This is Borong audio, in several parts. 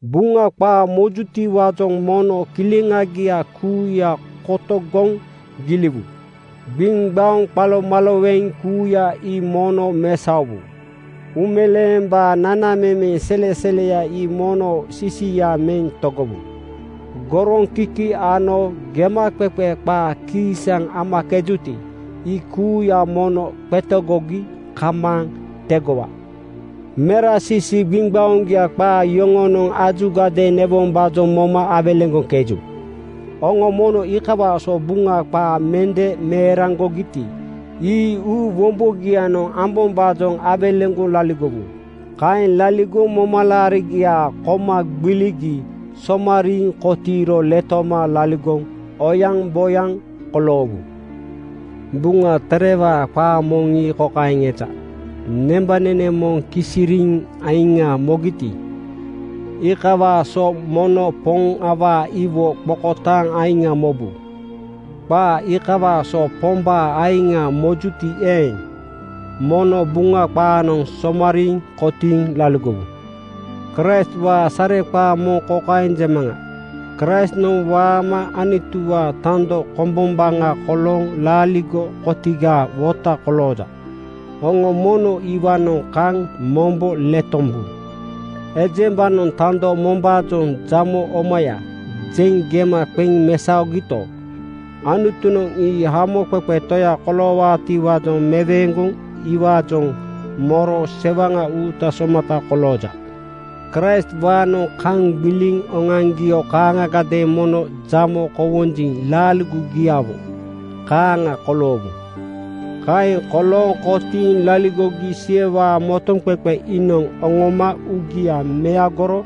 Buŋa qaa mojutiwaajoŋ mono kileŋagia kuuya kotogoŋ giliwu. Gbiŋgbaoŋ qalomaloweŋ kuuya ii mono mesaowu. Uumeleembaa nanamemeŋ seleseleya ii mono sisia meŋ togowu. Goroŋkiki ano gemaqeqe qaa kiisaŋ amakejuti, ii kuuya mono qetegogi kamaaŋ tegowa. Merasisi gbiŋgbaoŋgia qaa yoŋonoŋ ajugadeeŋ newombaajoŋ moma awelegoŋkeju. Oŋo mono iikawaa so Buŋa qaa mende meeraŋgogiti, ii uu wombogianoŋ ambombaajoŋ awelegoŋ laligowu. Kaeŋ laligoŋ momalaarigia koma gbiligi somariiŋ kotiiro letoma laligoŋ oyaŋboyaŋ koloowu. Buŋa Terewaa qaa moŋ ii kokaeŋ eja, “Nembanene moŋ kisiriiŋ aiŋa mogiti, iikawaa so mono Poŋ awaa iwo qokotaaŋ aiŋa mobu.” Qaa iikawaa so Pombaa aiŋa mojuti eeŋ, mono Buŋa qaanoŋ somariiŋ kotiiŋ laligowu. Kraistwaa sareqaa moŋ kokaeŋ jemaŋa: Kraistnoŋ waama Anutuwaa tando kombombaŋa kolooŋ laaligo kotigaa wota kolooja. Oŋo mono iwaanoŋ kaŋ mombo letombu. Ejembanoŋ tando mombaajoŋ “Jamo omaya,” jeŋ gema qeŋ mesaogito, Anutunoŋ ii Hamoqeqe Toya koloowaatiwaajoŋ meweeŋgoŋ iwaajoŋ moro sewaŋa uuta somata kolooja. Kraistwaanoŋ kaŋ gbiliŋ oŋoaŋgio kaaŋagadeeŋ mono jamo kowonjiŋ laaligogiawo kaaŋa koloowu. Kaeŋ kolooŋ kotiiŋ laligogi Siwewaa motoŋqeqe iinoŋ oŋoma uugia meagoro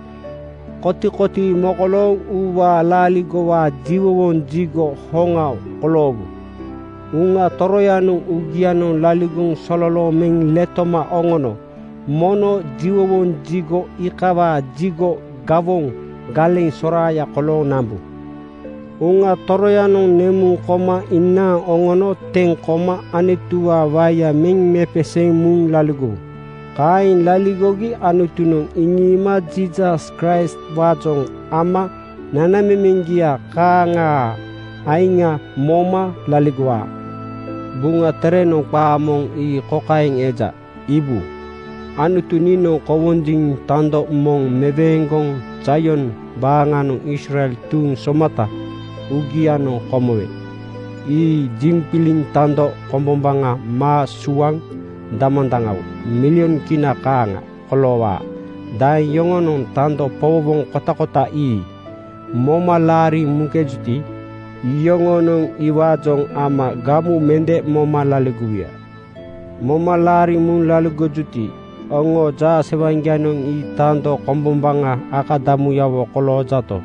kotikotii mokolooŋ uuwaa laaligowaa jiwowoŋ jigo hoŋa koloowu. Uŋa Toroyanoŋ uugianoŋ laligoŋ sololooŋ meŋ letoma oŋono mono jiwowoŋ jigo iikawaa jigo gawoŋ galeŋ soraaya kolooŋ nambu. Uŋa Toroyanoŋ nemuŋ koma inaaŋ oŋono teŋ koma Anutuwaa waeya meŋ mepeseeŋ muŋ laligowu. Kaeŋ laligogi Anutunoŋ iŋiima Jiisas Kraistwaajoŋ ama nanamemeŋgia kaaŋaa aiŋa moma laligowaa. Buŋa Terenoŋ qaa moŋ ii kokaeŋ eja: “Iibu, Anutu niinoŋ kowonjiŋ tando moŋ meweeŋgoŋ Zaion baaŋanoŋ Israel tuuŋ somata uugianoŋ komowe ii jiŋgbiliŋ tando kombombaŋa maa suaŋ damandaŋawo (milyon Kina kaaŋa) koloowaa. Daeŋ yoŋonoŋ tando powowoŋ kotakota ii moma laariŋ muŋkebuti, iyoŋonoŋ iwaajoŋ ama gamu mende moma laligowuya.” Moma laariŋ muŋ laligojuti, oŋoo jaasewaŋgianoŋ ii tando kombombaŋa akadamuyawo koloojato,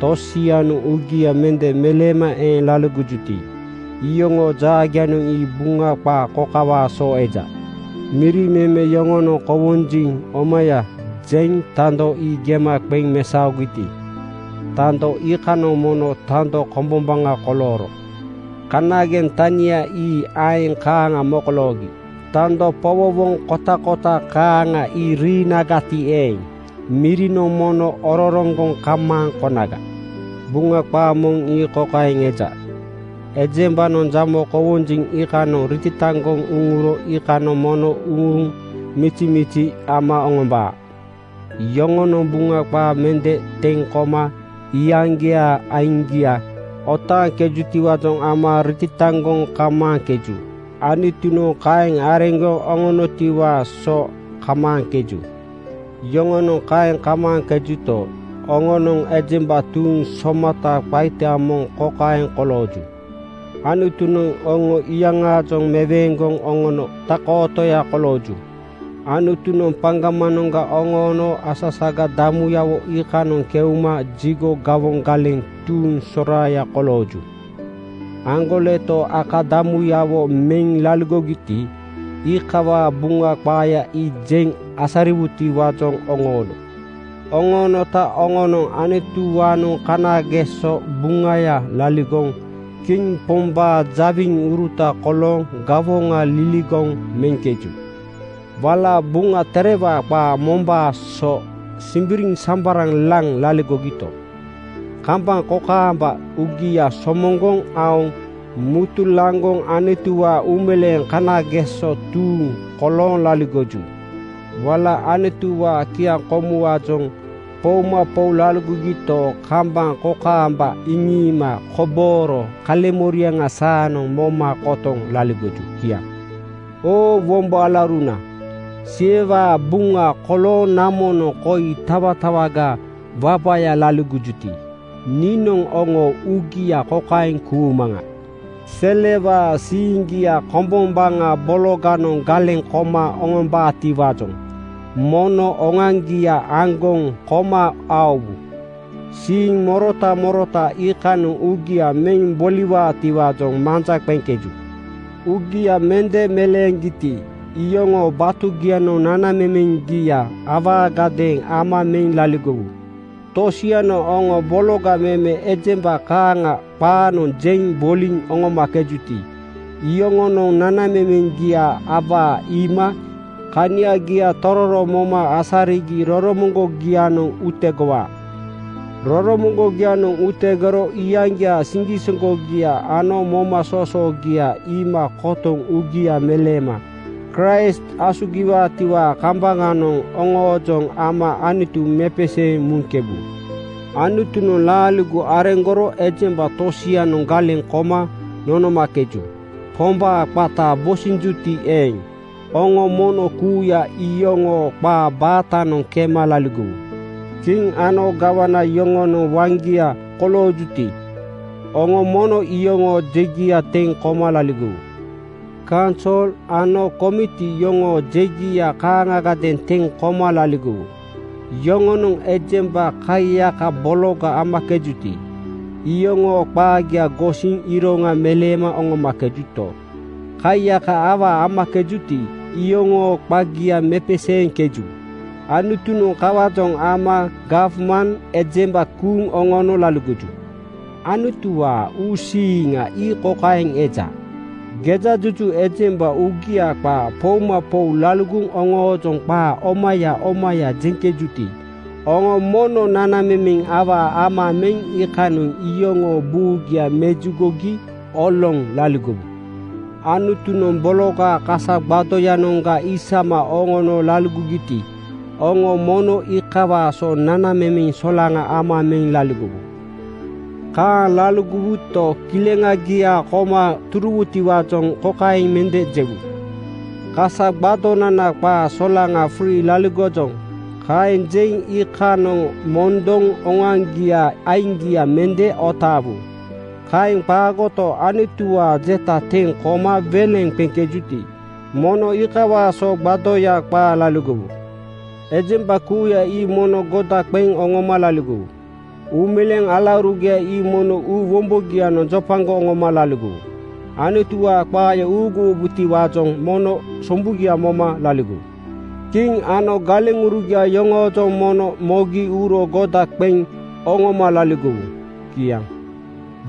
tosianoŋ uugia mende meleema eeŋ laligojuti, iyoŋoo jaagianoŋ ii Buŋa qaa kokawaa so eja: “Miri meme yoŋonoŋ ‘Kowonjiŋ omaya,’ jeŋ tando ii gema qeŋ mesaogiti, tando iikanoŋ mono tando kombombaŋa kolooro. Kanageŋ tania ii aeŋ kaaŋa mokoloogi. Tando powowoŋ kotakota kaaŋa ii riinagati eeŋ, mirinoŋ mono ororoŋgoŋ kamaaŋ konaga.” Buŋa qaa moŋ ii kokaeŋ eja, “Ejembanoŋ jamo kowonjiŋ iikanoŋ ritataŋgoŋ uŋuro iikanoŋ mono uŋuŋ mizimizi ama oŋombaa.” Yoŋonoŋ Buŋa qaa mende teŋ koma iyaŋgiaa aiŋgia otaaŋkejutiwaajoŋ ama ritataŋgoŋ kamaaŋkeju. Anutunoŋ kaeŋ areŋgoŋ oŋonotiwaa so kamaaŋkeju. Yoŋonoŋ kaeŋ kamaaŋkejuto, oŋonoŋ ejemba tuuŋ somata qaita moŋ kokaeŋ kolooju: Anutunoŋ oŋo iyaŋaajoŋ meweeŋgoŋ oŋono tak-kootoya kolooju. Anutunoŋ paŋgamanoŋga oŋoono asasaga damuyawo iikanoŋ keuma jigo gawoŋ galeŋ tuuŋ soraaya kolooju. Aŋgoleto akadamuyawo meŋ laligoroti, iikawaa Buŋa qaaya ii jeŋ asariwutiwaajoŋ oŋoono. Oŋoonota oŋonoŋ Anutuwaanoŋ kanageso buŋaya laligoŋ Kiŋ Pombaa jawiŋuruta kolooŋ gawoŋa liligoŋ meŋkeju. Wala Buŋa Terewaa qaa mombaa so “Simbiriŋsambaraŋ laŋ laligogito,” kambaŋ kokaamba uugia somoŋgoŋ aoŋ mutulaŋgoŋ “Anutuwaa uumeleeŋ kanageso tuuŋ” kolooŋ laligoju. Wala Anutuwaa kiaŋkomuwaajoŋ “Poumapou laligogito,” kambaŋ kokaamba “Iŋiima kobooro kaleŋmoriaŋa saanoŋ moma kotoŋ laligoju.” Kiaŋ. Oo wombo alauruna, Siwewaa buŋa kolooŋ namonoŋ koi tatawaga wabaya laligojuti, niinoŋ oŋoo uugia kokaeŋ kuumaŋa: Selewaa siiŋgia kombombaŋa bologanoŋ galeŋ koma oŋombabotiwaajoŋ mono oŋoaŋgia aŋgoŋ koma aowu. Siiŋ morota morota iikanoŋ uugia meŋ boliwaatiwaajoŋ manja qeŋkeju. Uugia mende meleeŋgiti, iyoŋoo batugianoŋ nanamemeŋgia awaagadeeŋ ama meŋ laligowu. Tosianoŋ oŋo bologa meme ejemba kaaŋa qaanoŋ jeŋ boliŋ oŋomakejuti, iyoŋonoŋ nanamemeŋgia awaa iima kaniagia tororo moma asarigi roromoŋgogianoŋ utegowaa. Roromoŋgogianoŋ utegoro iyaŋgiaa siŋgisoŋgogia ano momasoosoogia iima kotoŋ uugia meleema Kraist asugiwaatiwaa kambaŋanoŋ oŋoojoŋ ama Anutu mepeseeŋ muŋkebu. Anutunoŋ laaligo areŋgoro ejemba tosianoŋ galeŋ koma nonomakeju. Pombaa qata bosinjuti eeŋ, oŋo mono kuuya iyoŋoo qaa baatanoŋ kema laligowu. Kiŋ ano gawana yoŋonoŋ waŋgia koloojuti, oŋo mono iyoŋoo jegia teŋ koma laligowu. Kaunsol ano komiti yoŋoo jegia kaaŋagadeeŋ teŋ koma laligowu. Yoŋonoŋ ejemba kaiyaka bologa amakejuti, iyoŋoo qaagia gosiŋ iroŋa meleema oŋomakejuto, kaiyaka awaa amakejuti, iyoŋoo qagia mepeseeŋkeju. Anutunoŋ kawaajoŋ ama gawman ejemba kuuŋ oŋono laligoju. Anutuwaa uusiiŋa ii kokaeŋ eja: Gejajuju ejemba uugia qaa poumapou laligoŋ oŋoojoŋ qaa omaya omaya jeŋkejuti, oŋo mono nanamemeŋ awaa ama meŋ iikanoŋ iyoŋoo buugia mejugogi oloŋ laligowu. Anutunoŋ bologaa kasa gbadoyanoŋga isama oŋono loloogiti, oŋo mono iikawaa so nanamemeŋ solaŋa ama meŋ laligowu. Kaaŋ laligowuto, kileŋagia koma turuwutiwaajoŋ kokaeŋ mende jewu: “Kasa gbadonana qaa solaŋa (frii) laligojoŋ.” Kaeŋ jeŋ iikanoŋ mondoŋ oŋoaŋgiaa aiŋgia mende otaawu. Kaeŋ qaagoto, Anutuwaa jeta teŋ koma weleŋ qeŋkejuti, mono iikawaa so gbadoya qaa laligowu. Ejemba kuuya ii mono goda qeŋ oŋoma laligowu. Uumeleeŋ alaurugia ii mono uu wombogianoŋ jopagoŋ oŋoma laligowu. Anutuwaa qaaya uuguwombotiwaajoŋ mono sombugia moma laligowu. Kiŋ ano galeŋurugia yoŋoojoŋ mono mogi uro goda qeŋ oŋoma laligowu. Kiaŋ.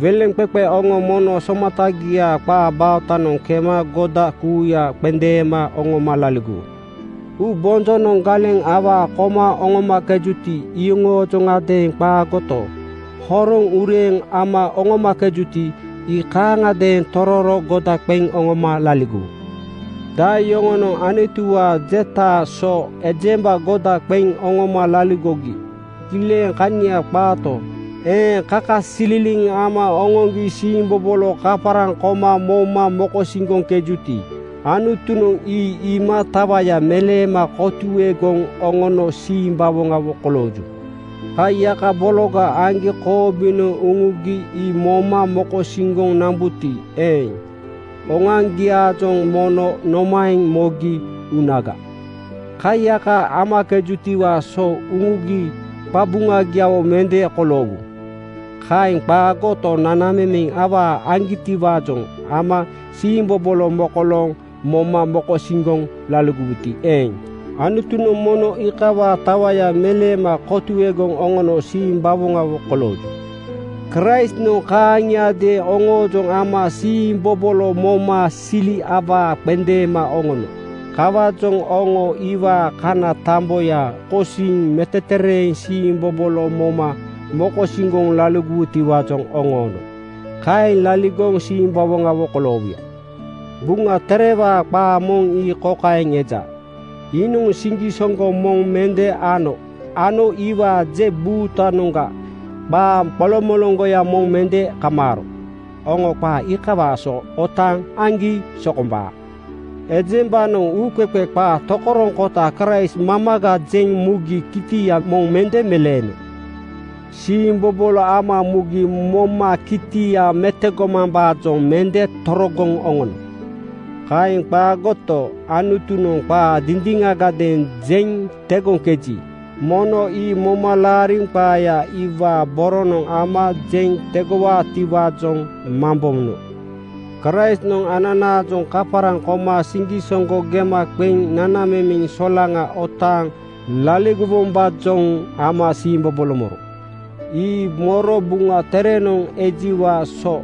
Weleŋqeqe oŋo mono somatagiaa qaa baatanoŋ kema goda kuuya qendeema oŋoma laligowu. Uubonjonoŋ galeŋ awaa koma oŋomakejuti, iyoŋoojoŋadeeŋ qaagoto, horoŋ ureeŋ ama oŋomakejuti, ii kaaŋagadeeŋ tororo goda qeŋ oŋoma laligowu. Daeŋ yoŋonoŋ Anutuwaa jetaa so ejemba goda qeŋ oŋoma laligogi kileŋ kania qaato, eeŋ kakasililiŋ ama oŋoŋgi siimbobolo kaparaŋ koma moma mokosiŋgoŋkejuti, Anutunoŋ ii iima tawaya meleema kotuegoŋ oŋono simbawoŋawo kolooju. Kaiyaka bologa aŋgi koobinoŋ uŋugi ii moma mokosiŋgoŋ nambuti eeŋ, oŋoaŋgiaajoŋ mono nomaeŋ mogi unaga? Kaiyaka amakegitiwaa so uŋugi qabuŋagiawo mende koloowu. Kaeŋ qaagoto, nanamemeŋ awaa aŋgitiwaajoŋ ama siimbobolo mokolooŋ moma mokosiŋgoŋ laligowuti eeŋ, Anutunoŋ mono iikawaa tawaya meleema kotuegoŋ oŋono simbawoŋawo kolooju. Kraistnoŋ kaaŋiadeeŋ oŋoojoŋ ama siimbobolo moma sili awaa qendeema oŋono. Kawaajoŋ oŋo iwaa kana tamboya kosiŋ metetereeŋ siimbobolo moma mokosiŋgoŋ laligowutiwaajoŋ oŋoono. Kaeŋ laligoŋ simbawoŋawo koloowuya. Buŋa Terewaa qaa moŋ ii kokaeŋ eja, “Iinoŋ siŋgisoŋgo moŋ mende ano ano iwaa je buutanoŋga qaa qolomoloŋgoya moŋ mende kamaaro.” Oŋo qaa iikawaa so otaaŋ aŋgi sokombaa. Ejembanoŋ uuqeqe qaa tokoroŋkota Kraist mamaga jeŋ mugi kitia moŋ mende meleeno. Siimbobolo ama mugi moma kitia metogomambaajoŋ mende torogoŋ oŋono. Kaeŋ qaagoto, Anutunoŋ qaa dindiŋagadeeŋ jeŋ tegoŋkeji, mono ii moma laariŋ qaaya iwaa boronoŋ ama jeŋ tegowaatiwaajoŋ mambono. Kraistnoŋ ananaajoŋ kaparaŋ koma siŋgisoŋgo gema qeŋ nanamemeŋ solaŋa otaaŋ laligowombaajoŋ ama siimbobolo moro. Ii moro Buŋa Terenoŋ ejiwaa so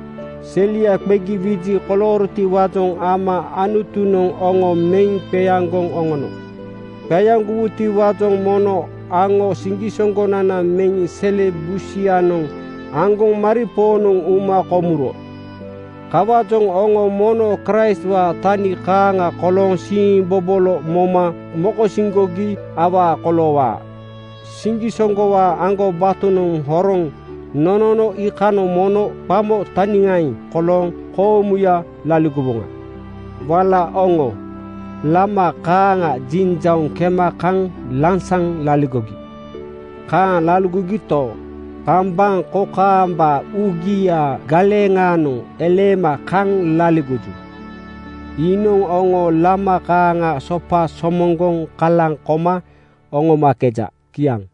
“Selia qegi wiji koloorotiwaajoŋ ama Anutunoŋ oŋo meŋ qeaŋgoŋ oŋono.” Qeaŋgowutiwaajoŋ mono “Aŋo siŋgisoŋgonana meŋ sele busianoŋ aŋgoŋ” maripoonoŋ uma komuro. Kawaajoŋ oŋo mono Kraistwaa tani kaaŋa kolooŋ siimbobolo moma mokosiŋgogi awaa koloowaa. Siŋgisoŋgowaa aŋgobatonoŋ horoŋ nonono iikanoŋ mono qamo taniŋaeŋ kolooŋ koomuya laligowoŋa. Wala oŋo “Lama kaaŋa jinjauŋ kema kaŋ lansaŋ laligogi.” Kaaŋ laligogito, kambaŋ kokaamba uugiaa galeŋaanoŋ eleema kaŋ laligoju. Iinoŋ oŋo lama kaaŋa sopa somoŋgoŋ kalaŋ koma oŋomakeja. Kiaŋ.